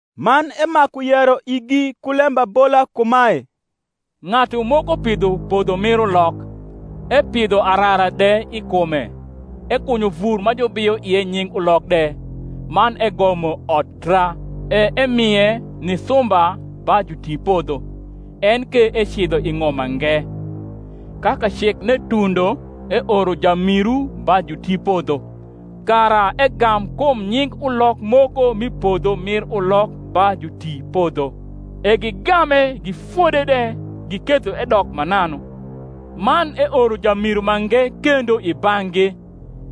Man emaku yero igi ku lembabola kumae, Ng’atu moko pidho podho mir ulok, epidho arara de i kume, ekunyo vur ma jubiyo ie nying ulok de, man egomo odtra, e emie ni sumba ba jutipodho, en ke ecidho i ng’om mange. Ka kacekne tundo eoro jamiru ba jutipodho, kara egam kum nying ulok moko m’i podho mir ulok ba jutipodho. E gigame, gifode de, giketho edok mananu. Man eoro jamiru mange kendo i bang’gi;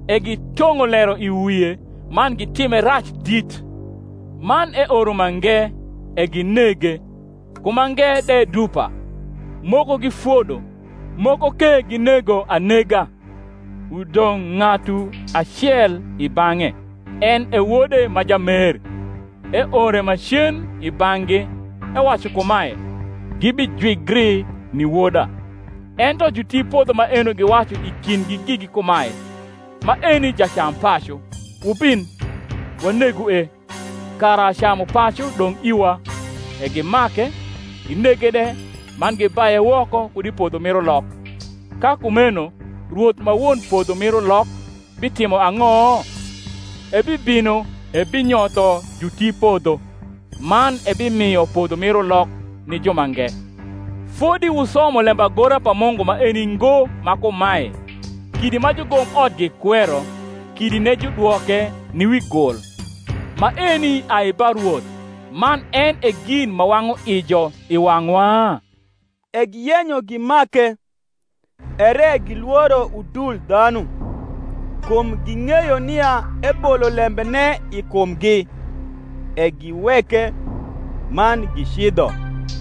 e gitong’o lero i wie, man gitime rac dit. Man eoro mange; e ginege: ku mange de dupa; moko gifodo, moko ke ginego anega. Udong’ ng’atu acel i bang’e, en e wode ma jamer: eore macen i bang’gi, ewacu kumae, Gibijwigri ni woda. Ento jutipodho maeno giwacu i kindgi gigi kumae, Maeni jacampacu; wubin, wanegue, kara camupacu dong’ iwa. E gimake, ginege de, man gibaye woko kud i podho mir ulok. Ka kumeno rwoth ma won podho mir ulok bitimo ang’o? ebibino ebinyotho jutipodho, man ebimio podho mir ulok ni jumange. Fodi wusomo lembagora pa Mungu maeni ngo ma kumae, Kidi ma jugomot gikwero, Kidine judwoke ni wi gul; Maeni ai ba Rwoth, Man en e gin ma wang’u ijo i wang’wa? E giyenyo gimake; ere gilworo udul dhanu; kum ging’eyo nia ebolo lembene i kumgi; e giweke, man gicidho.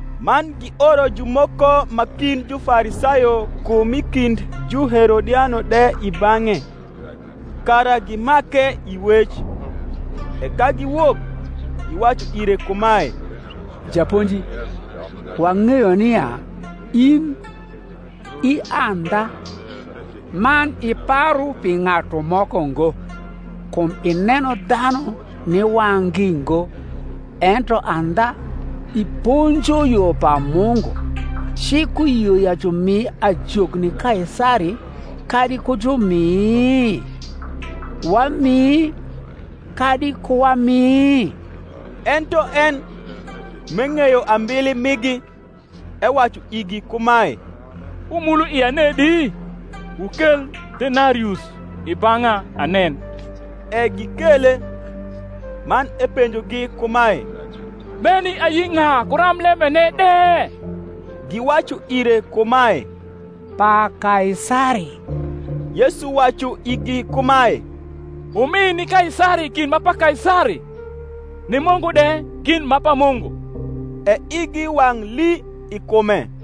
Man gioro jumoko ma kind Jufarisayo ku m’i kind Juherodiano de i bang’e, kara gimake i wec. E ka giwok, giwacu ire kumae, Japonji, wang’eyo nia in i andha, man iparu pi ng’atu moko ngo; kum ineno dhanu ni wang’gi ngo, ento andha iponjo yo pa Mungu: Cik uyio ya jumi ajok ni Kaisari, kadi ku jumi? Wami, kadi ku wami? Ento en, m’eng’eyo ambili migi, ewacu igi kumae, Wumulo ia nedi? wukel denarius i bang’a, anen. E gikele. Man epenjogi kumae, Meni ayi ng’a ku ramblembene de? Giwacu ire kumae, Pa Kaisari. Yesu wacu igi kumae, Wumi ni Kaisari gin ma pa Kaisari, ni Mungu de gin ma pa Mungu. E igi wang’ lii i kume.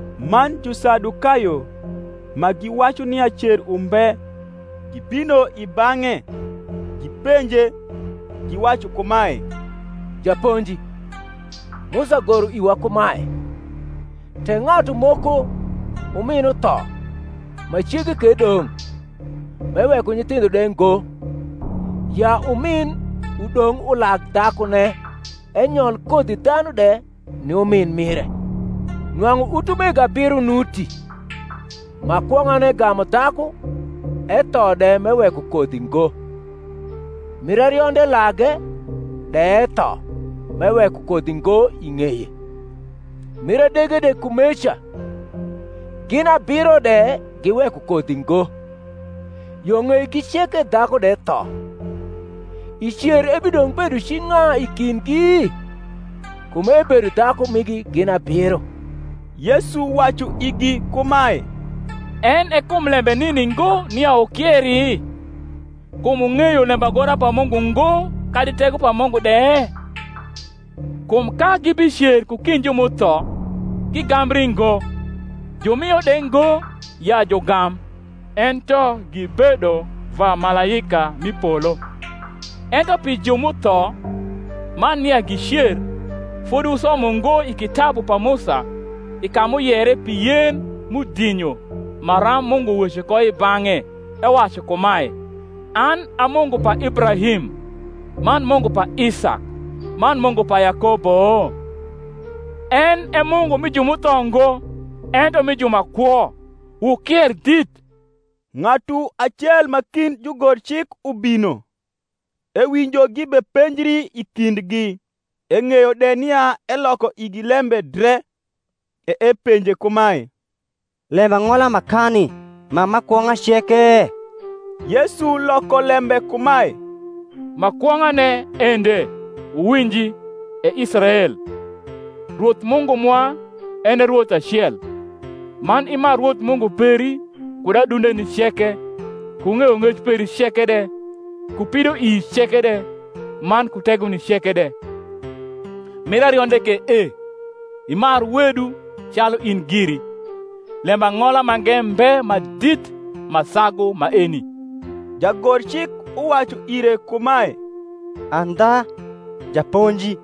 Man Jusadukayo, ma giwacu nia cer umbe, gibino i bang’e; gipenje, giwacu kumae, Japonji, Musa goro iwa kumae, Tek ng’atu moko umin utho, ma cege ke dong’, m’eweko nyithindho de ngo, ya umin udong’ ulag dhakune, enyol kodhidhanu de ni umin mire. Nwang’u utumego abiro nuti: ma kwong’ane gamu dhaku, etho de m’eweko kodhi ngo; mir arionde lage, de etho, m’eweko kodhi ngo i ng’eye; mir adege de kumeca: gin abiro de giweko kodhi ngo. Yo ng’eigi ceke dhaku de tho. I cer ebidong’ bedo ci ng’a i kindgi? kum ebedo dhaku migi gin abiro. Yesu wacu igi kumae, En e kum lembc nini ngo nia wukieri, kum wung’eyo lembagora pa Mungu ngo, kadi tego pa Mungu de? Kum ka gibicer ku kind ju m’utho. gigambri ngo, jumio de ngo ya jugam; ento gibedo va malaika m’i polo. Ento pi ju m’utho, ma nia gicer; fodi wusomo ngo i kitabu pa Musa, i ka m’uyere pi Yen m’udinyo, maram Mungu weco ko i bang’e, ewacu kumae, An a Mungu pa Ibrahim, man Mungu pa Isak, man Mungu pa Yakobo? En e Mungu mi ju m’utho ngo, ento mi ju ma kwo: wukier dit. Ng’atu acel ma kind jugorcik ubino, ewinjo gibepenjri i kindgi, eng’eyo de nia eloko igi lembe dre, e epenje kumae, Lembang’ola makani ma ma kwong’a ceke? Yesu loko lembe kumae, Ma kwong’ane ende, Wuwinji, E Israel; Rwoth Mungu mwa, en e Rwoth acel: man imar Rwoth Mungu peri kud adundeni ceke, ku ng’eyong’ec peri ceke de, ku pidoii ceke de, man ku tegoni ceke de. Mir arionde ke e, Imar wedu calu in giri. Lembang’ola mange mbe ma dit ma sagu maeni. Jagorcik uwacu ire kumae, Andha, Japonji,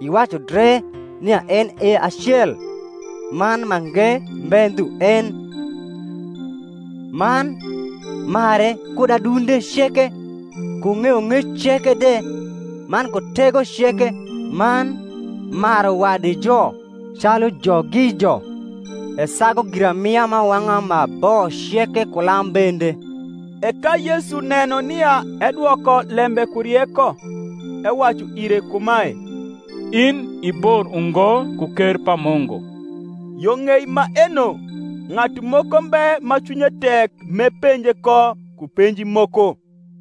iwacu dre nia en e acel: man mange mbe ndhu en: man mare kud adunde ceke, ku ng’eyong’ec ceke de, man ku tego ceke, man maru wadijo calu jogijo, esagu giramia m’awang’a ma bo ceke ku lam bende. E ka Yesu neno nia edwoko lembe ku rieko, ewacu ire kumae, In i bor ungo ku ker pa Mungu. Yo ng’ei maeno ng’atu moko mbe ma cwinye tek m’epenje ko ku penji moko.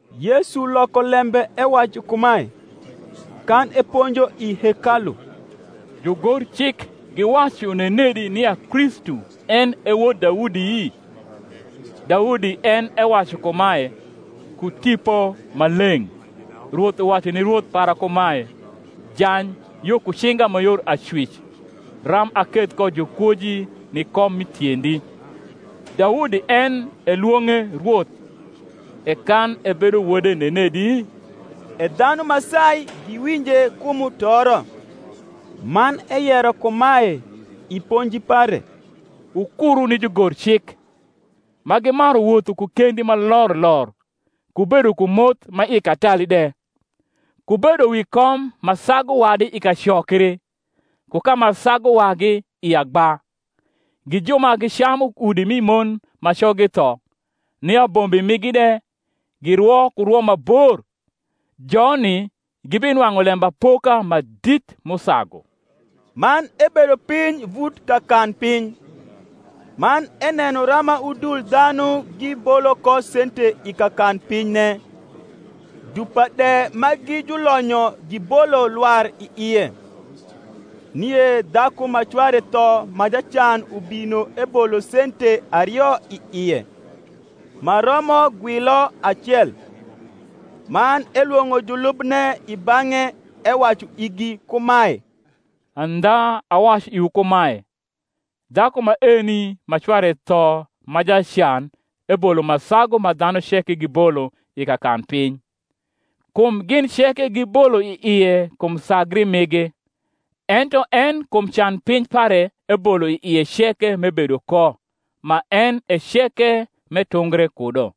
Yesu loko lembe ewacu kumae, kan eponjo i hekalu, Jugorcik giwacu nenedi nia Kristu en e wod Daudi? Daudi en ewacu kumae, ku Tipo Maleng’, Rwoth uwacu ni Rwoth para kumae, Jany yo ku cinga ma yor acwic, Ram aketh ko jukwoji ni kom mi tiendi. Daudi en elwong’e Rwoth; e kan ebedo wode nenedi? E dhanu ma sai giwinje ku mutoro. Man eyero kumae, i ponji pare, Wukuru ni jugorcik, ma gimaru wotho ku kendi ma lor lor, ku bedo ku moth ma i katali de, ku bedo wi kom ma sagu wadi i kacokri, ku ka ma sagu wagi i agba: gi ju ma gicamu udi mi mon ma coggi tho, ni abombi migi de girwo ku rwo ma bor; joni gibinwang’u lembapoka ma dit m’usagu. Man ebedo piny vut kakanpiny, man eneno rama udul dhanu gibolo ko sente i kakanpinyne: dupa de ma gi julonyo gibolo lwar i ie. Nie dhaku ma cware tho ma jacan ubino ebolo sente ario i ie, ma romo gwilo acel. Man elwong’o julubne i bang’e ewacu igi kumae, Andha awacu iwu kumae, Dhaku maeni ma cware tho ma jacan ebolo ma sagu ma dhanu ceke giboio i kakanpiny: kum gin ceke gibolo i ie kum sagri migi; ento en kum canpiny pare ebolo i ie ceke m’ebedo ko, ma en e ceke m’etungre kudo.